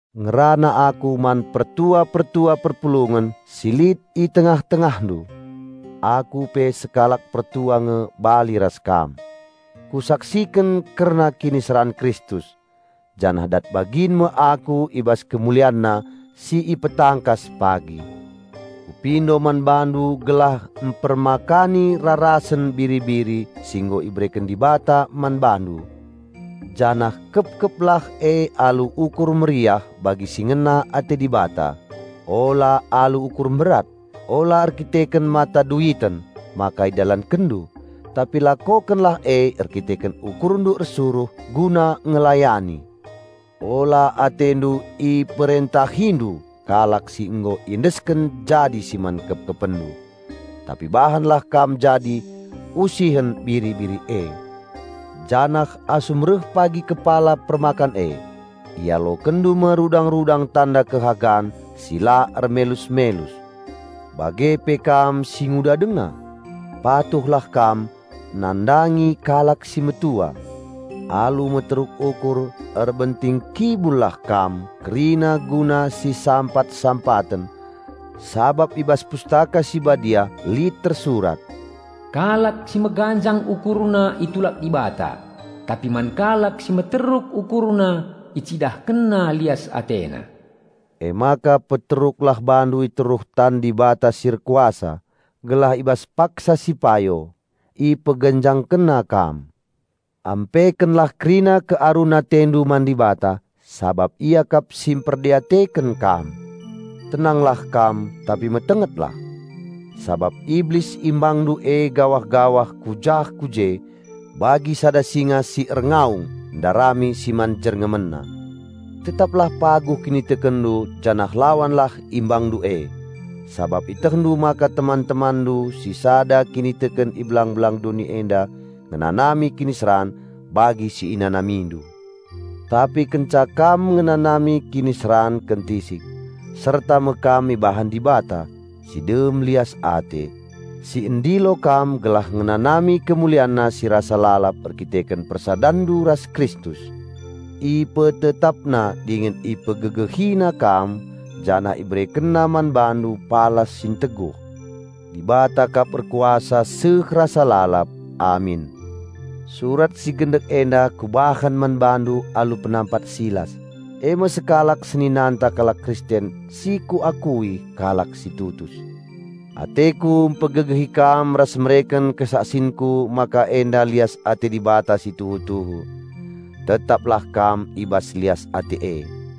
Ngerana aku man pertua-pertua perpulungen si lit i tengah-tengahndu. Aku pe sekalak pertua nge bali ras kam. Kusaksiken kerna kiniseran Kristus janah dat bagin me aku i bas KemulianNa si ipetangkas pagi. Kupindo man bandu gelah mpermakani rarasen biri-biri si nggo ibereken Dibata man bandu, janah kepkeplah e alu ukur meriah bagi si ngena ate Dibata, ula alu ukur mberat. Ula erdandanken mata duiten maka idalankenndu, tapi lakokenlah e erdandanken ukurndu ersuruh guna ngelayani. Ula atendu iperentahindu kalak si nggo iendesken jadi si man kepkepenndu, tapi bahanlah kam jadi usihen biri-biri e. Janah asum reh pagi Kepala Permakan e, ialokenndu me rudang-rudang tanda kehormaten si mulia si la ermelus-melus. Bage pe kam si nguda denga, patuhlah kam nandangi kalak si metua. Alu meteruk ukur erbentingkibullah kam kerina guna sisampat-sampaten. Sabap i bas Pustaka Si Badia lit tersurat, "Kalak si meganjang ukurna itulak Dibata, tapi man kalak si meteruk ukurna IcidahkenNa lias AteNa." Emaka peteruklah bandu iteruh tan Dibata si erkuasa, gelah i bas paksa si payo, IpeganjangkenNa kam. Ampekenlah kerina kearun atendu man Dibata, sabap Ia kap si mperdiateken kam. Tenanglah kam tapi metengetlah! Sabap Iblis imbangndu e gawah-gawah ku jah ku je bagi sada singa si erngaung ndarami si man jerngemenna. Tetaplah paguh kinitekenndu janah lawanlah imbangndu e, sabap ietehndu maka teman-temanndu si sada kiniteken i belang-belang doni enda ngenanami kiniseran bagi si inanamindu. Tapi kenca kam ngenanami kiniseran kentisik, serta me kam ibahan Dibata, Si dem lias ate, Si ndilo kam gelah ngenanami KemulianNa si rasa lalap erdandanken persadanndu ras Kristus; IpetetapNa dingen IpegegehiNa kam janah IberekenNa man bandu palas si nteguh. Dibata kap erkuasa seh rasa lalap. Amin! Surat si gendek enda kubahan man bandu alu penampat Silas, e me sekalak seninanta kalak Kristen si kuakui kalak si tutus. Ateku pegegehi kam ras mereken kesaksinku maka enda lias ate Dibata si tuhu-tuhu. Tetaplah kam i bas lias ate e.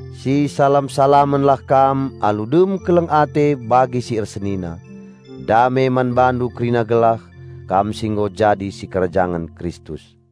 Sisalam-salamenlah kam alu dem keleng ate bagi si ersenina. Dame man bandu kerina gelah, kam si nggo jadi sikerajangen Kristus.